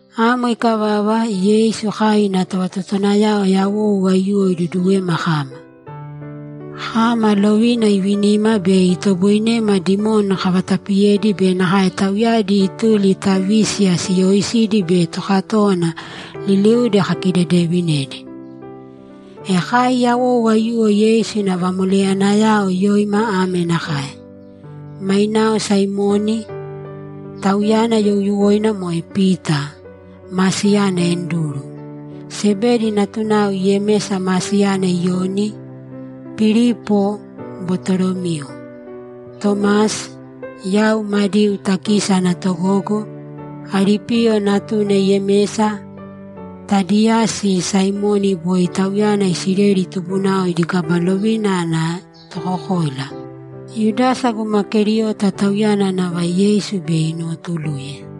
Amo ikavava, Yeisu kai ina tovatotowanayao yawou aiyuwo iduduwema kama. Kama, lovina ivinima bei itoboinema dimoni kavatapiyedi be nakae tauyadi ituli ta vísiya siyooisidi be tokatówana liliudi kakidedevinedi. E kai yawou aiyuwo Yeisu ina vamoleyanayao yoima ame nakae: Mainao Saimoni, tauyana youyuwoina moe Pita, ma siyana Anduru, Sebedi natunao Yemesa ma siyana Iyoni, Pilipo, Batolomiu, Tomasi, yau Madiu takisi ana togogo, Alipiyo natuna Yemesa, Tadiyasi, Saimoni (boi tauyana Isileli tubunao idi kaba lovina ana tokokoila), Yudasa guma Keriota, tauyana nava Yeisu bei inuwotuluye.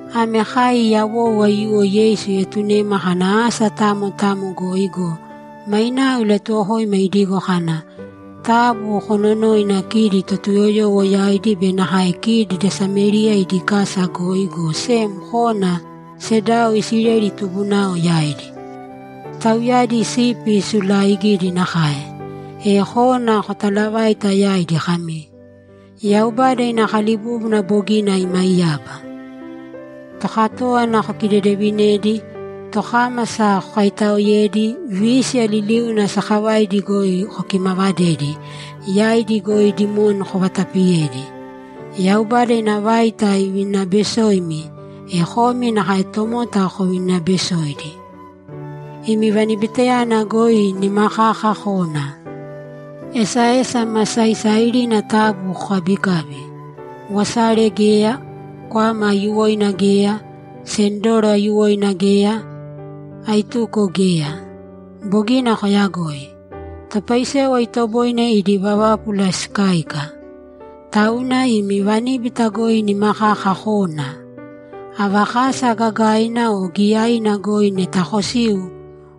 Ame kai yawou aiyuwo Yeisu ietunema kana asa tamo tamo goi go, mainao ilatuwokoima idigo kana, ‘Taabu kononōina kidi Totuyoyowo yaidi be nakae kidi da Samériya idi kasa goi, go sem kōna sedao Isileli tubunao yaidi. Tauyadi sipi sulaaigidi nakae. E kōna kotalavāita yaidi kami, “Yaubada ina kalibúbuna bogina imaiyaba.” Tokatówana kokidedevinēdi, tokámasa kokaitaoēdi, vísiya liliuna sakavaidi goi kokimavadēdi, yaidi goi dimoni kovatapiyēdi. Yaubada ina vaita ivinibesoimi, e komi nakae tomota kovinibesōidi. Imi vanibitayana goi nima kaka kōna. Esaesa ma saisairina taabu kokabikābi. Wasare geya, kwama aiyuwoina geya, sendoro aiyuwoina geya, aituko geya. Bogina koyagoi. Topaisewa itoboinedi idi vavápula sikáika. Tauna imi vaníbita goi nima kaka kōna. Ava kasa, gagaina o giyaina goi, neta kosiu,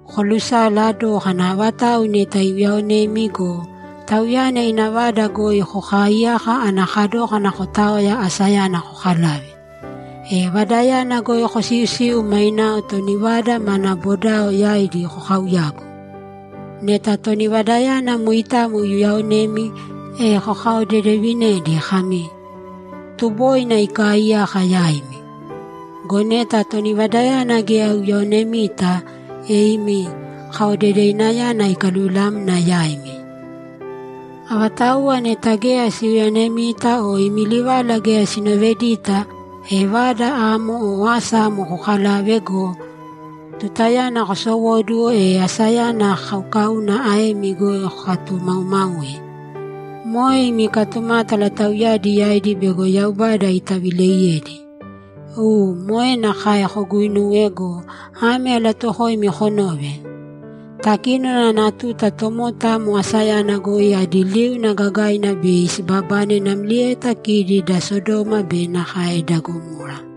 kolusala dōkana avatau neta iuyaonemi go, tauyana ina vada goi kokaaiyāka ana kadókana kotaoya asayana kokalave. E vadayana goi kosiusiu mainao toni vada mana bodao yaidi kokauyāgu. Neta toni vadayana moitamo iuyaonemi, e kokaodedevinēdi kami, “Tuboina ikaaiyaka yaimi.” Go neta toni vadayana geya iuyaonemita, e imi kaodedevinayana ikaluvilamna yaimi. Avatauwa neta geya siuyaonemita o imi livala geya sinovedita, e vada amo o asa amo kokalāve go, tutayana kosowóduwo, e asayana kaukauna aemi goi kokatumaumāui. Moe imi katumátala tauyadi yaidi bego Yaubada itavileiyedi. U, moe nakae koguinūwe go, ame alatuuwokoimi konōve: Takínona ana tuta tomota amo asayana goi adi liuna gagaina bei sibabane namlieta kidi da Sodoma be nakae da Gamora.’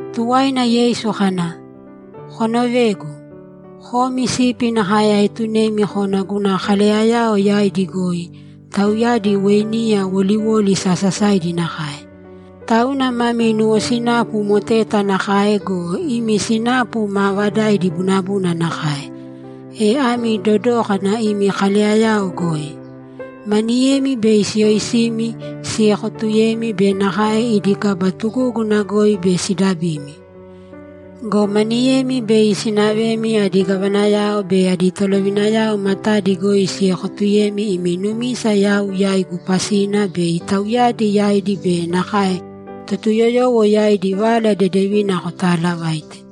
Tuwaina Yeisu kana, ‘Konovēgu. Komi sipi nakae aetunemi kona guna kaleyayao yaidi goi; tauyadi weiniya woliwoli sasasaidi nakae. Tauna mami nuwosinapu moteta nakae go, imi sinapu maavadaidi bunabuna nakae. E ami dodōkana imi kaleyayao goi. Maniyemi bei siyoisimi, siekotuyemi be nakae idi kaba tugúguna goi bei sidabimi. Go maniyemi bei sinavemi adi gavanayao be adi tolovinayao matadi goi siekotuyemi imi numisa yau yaigu pasina, bei tauyadi yaidi be nakae Totuyoyowo yaidi Vala Dedevina kotalavaite.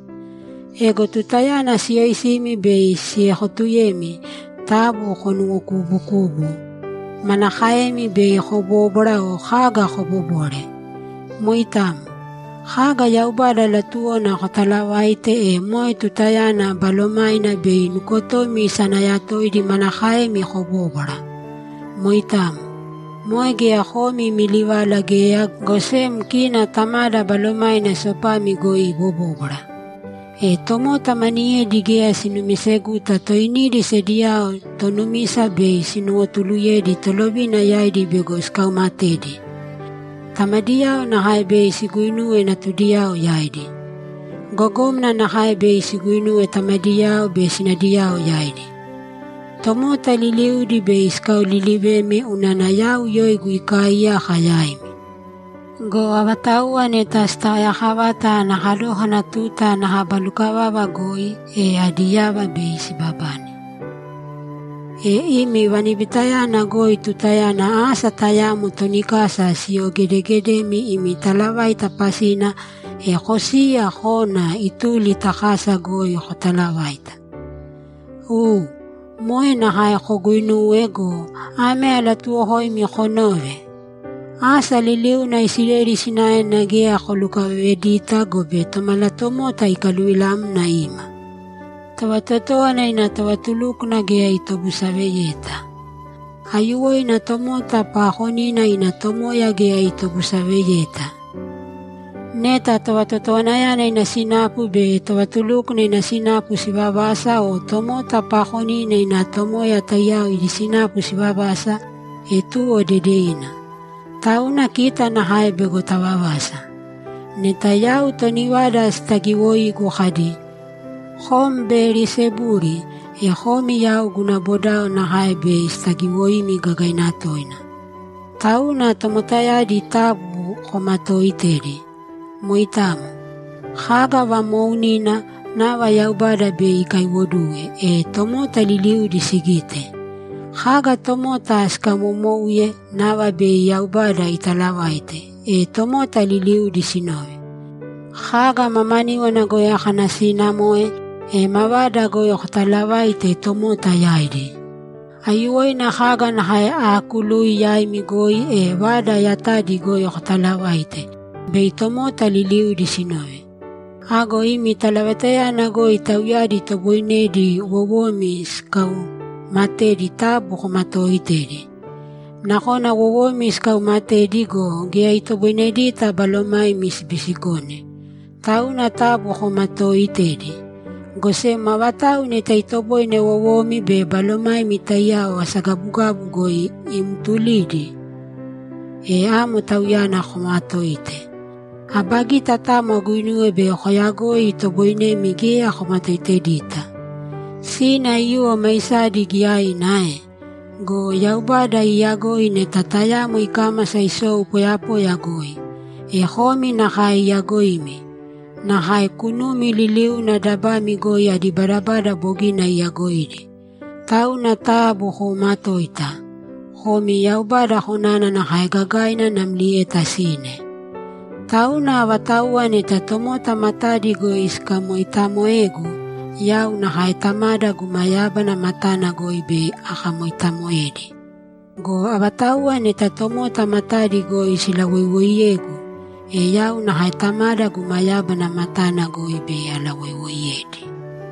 Ego tutayana siyoisimi bei siekotuyemi, taabu konuwokuubukūbu manakaemi bei kobóbwara o kaga kobobore. Moitamo. Kaga Yaubada latuwona kotalavaite, e moe tutayana Balomaina bei nukotomi isanayatoidi manakaemi kobóbwara. Moitamo. Moe geya komi imi livala geya, go sem kina Tamada Balomaina sopami goi ibobóbwara. E tomota maniyedi geya sinumiseguta toinidi sediyao tonumisa bei sinuwotuluyedi tolovina yaidi bego sikaumatedi. Tamadiyao nakae bei siguinuwe natudiyao yaidi. Gogómana nakae bei siguinuwe tamadiyao be sinadiyao yaidi. Tomota liliudi bei sikaolilivemi unana yau yoigu ikaaiyaka yaimi. Go avatauwa neta sitaoyakavata ana kadókana tuta ana kaba lukavava goi, e adi yava bei sibabane. E imi vanibitayana goi tutayana asa tayamo toni kasa siyogedegedemi imi talavaita pasina, e kosīya kōna ituli ta kasa goi kotalavāita. U, moe nakae koguinūwe go, ame alatuuwokoimi konōve: Asa liliuna Isileli sinaena geya kolukavavedita gobe Tomalatomota ikaluvilamna ima. Tovatotówana ina tovatulúkwana geya itobusaveyeta. Aiyuwoina tomota paakonina ina tomoya geya itobusaveyeta. Neta tovatotowanayana ina sinapu be tovatulúkwana ina sinapu sivavasa o tomota paakonina ina tomoya taiyao idi sinapu sivavasa, e tuwo dedevina. Tauna kita nakae bego tavavasa. Neta yau toni vada sitagiwoigu kadi, “Kom Beyelisebuli”, e komi yau guna bodao nakae bei sitagiwoimi gagaina toina. Tauna tomotayadi taabu komatooitēdi. Moitamo. Kaga vamoounina, nava Yaubada bei ikaiwoduwe, e tomota liliudi sigite. Kaga tomota sikamomouye, nava bei Yaubada italavaite, e tomota liliudi sinove. Kaga mamaníwana goi akanasiinamoe, e mavada goi kotalavāite tomota yaidi. Aiyuwoina kaga nakae aakului yaimi goi, e vada yatadi goi kotalavāite, bei tomota liliudi sinove. Ago imi talavaitayana goi tauyadi itoboinedi wowomi sikauumatedi taabu komatooitēdi. Nakona wowomi sikaumatedi go, geya itoboinedita balomaimi sibisikone. Tauna taabu komatooitēdi. Go sem avatau neta itoboine wowomi be balomaimi taiyao asagabugabu goi imtulidi, e amo Tauyana koomatōite. Aba gita tamo aguinuwe bei koyagoi itoboinemi geya komatoitedita. Sine aiyuwo maisadi giyaina ae? Go Yaubada iiyagoi neta tayamo ikámasa isou poyapoya goi. E komi nakae iyagoimi. Nakae kunumi liliuna dabami goi adi badabada bogina iyagoidi. Tauna taabu koomatōita. Komi Yaubada konana nakae gagaina namlieta sine. Tauna avatauwa neta tomota matadi goi sikamoitamoegu, yau nakae Tamada guma yábana matana goi bei akamoitamoedi. Go avatauwa neta tomota matadi goi silawoiwoiyegu, e yau nakae Tamada guma yábana matana goi bei alawoiwoiyedi.’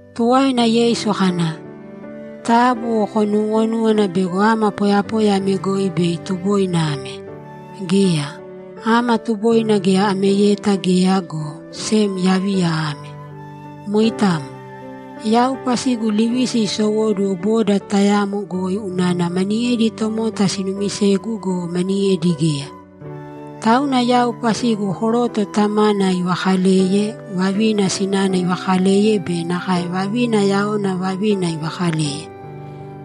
Tuwaina Yeisu kana, ‘Taabu konuuwonūwana bego ama poyapoya ame goi bei tuboina ame. Geya. Ama tuboina geya ameyeta geya, go sem yaviya ame. Moitamo. Yau pasigu livisi isowóduwo boda tayamo goi unana maniyedi tomota sinumisegu go, maniyedi geya. Tauna yau pasigu koroto tamana ivakaleye, vavina sinana ivakaleye be nakae vavina yaona vavina ivakaleye.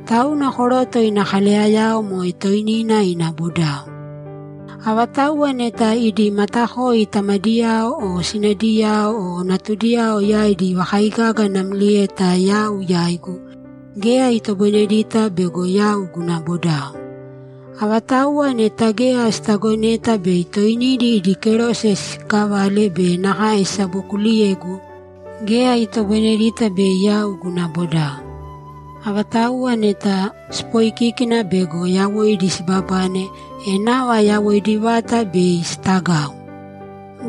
Tauna koroto ina kaleyayao moe toinina ina bodao. Avatauwa neta idi matakoi tamadiyao o sinadiyao o natudiyao yaidi ivakaigaga namlieta yau yaigu, geya itoboinedita bego yau guna bodao. Avatauwa neta geya sitagoneta bei toinidi idi kerose siikavale be nakae sisabokuuliyegu, geya itoboinedita bei yau guna bodao. Avatauwa neta sipoikiki bego yawoidi sibabane, e nava yawoidi vata bei sitagau.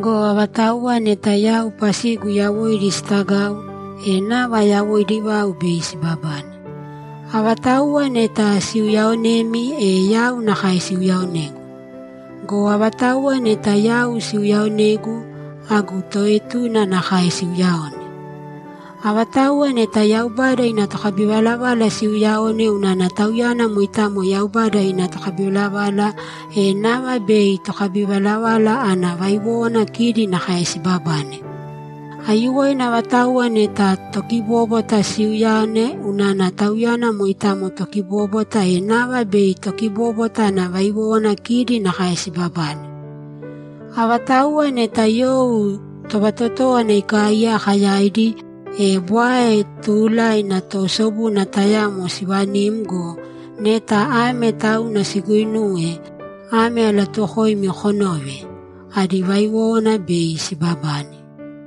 Go avatauwa neta yau pasigu yawoidi sitagau, e nava yawoidi vau bei sibabane. Avatauwa neta siuyaaonemi, e yau nakae siuyaaonegu. Go avatauwa neta yau siuyaaonegu, agu toetuna nakae siiuyaone. Avatauwa neta Yaubada ina tokabivalavala siiuyaone unana tauyana moitamo Yaubada ina tokabivalavala, e nava bei tokabivalavala ana vaiwówana kidi nakae sibabane. Aiyuwoina avatauwa neta tokibóbwata siiuyaone unana tauyana moitamo tokibóbwata, e nava bei tokibobwata ana vaiwówana kidi nakae sibabane. Avatauwa neta you tovatotówana ikaaiyaka yaidi, e bwae tuulaina toosobuna tayamo sivanim go, neta ame tauna siguinuwe, ame alatuuwokoimi konōve: Adi vaiwówana bei sibabane.’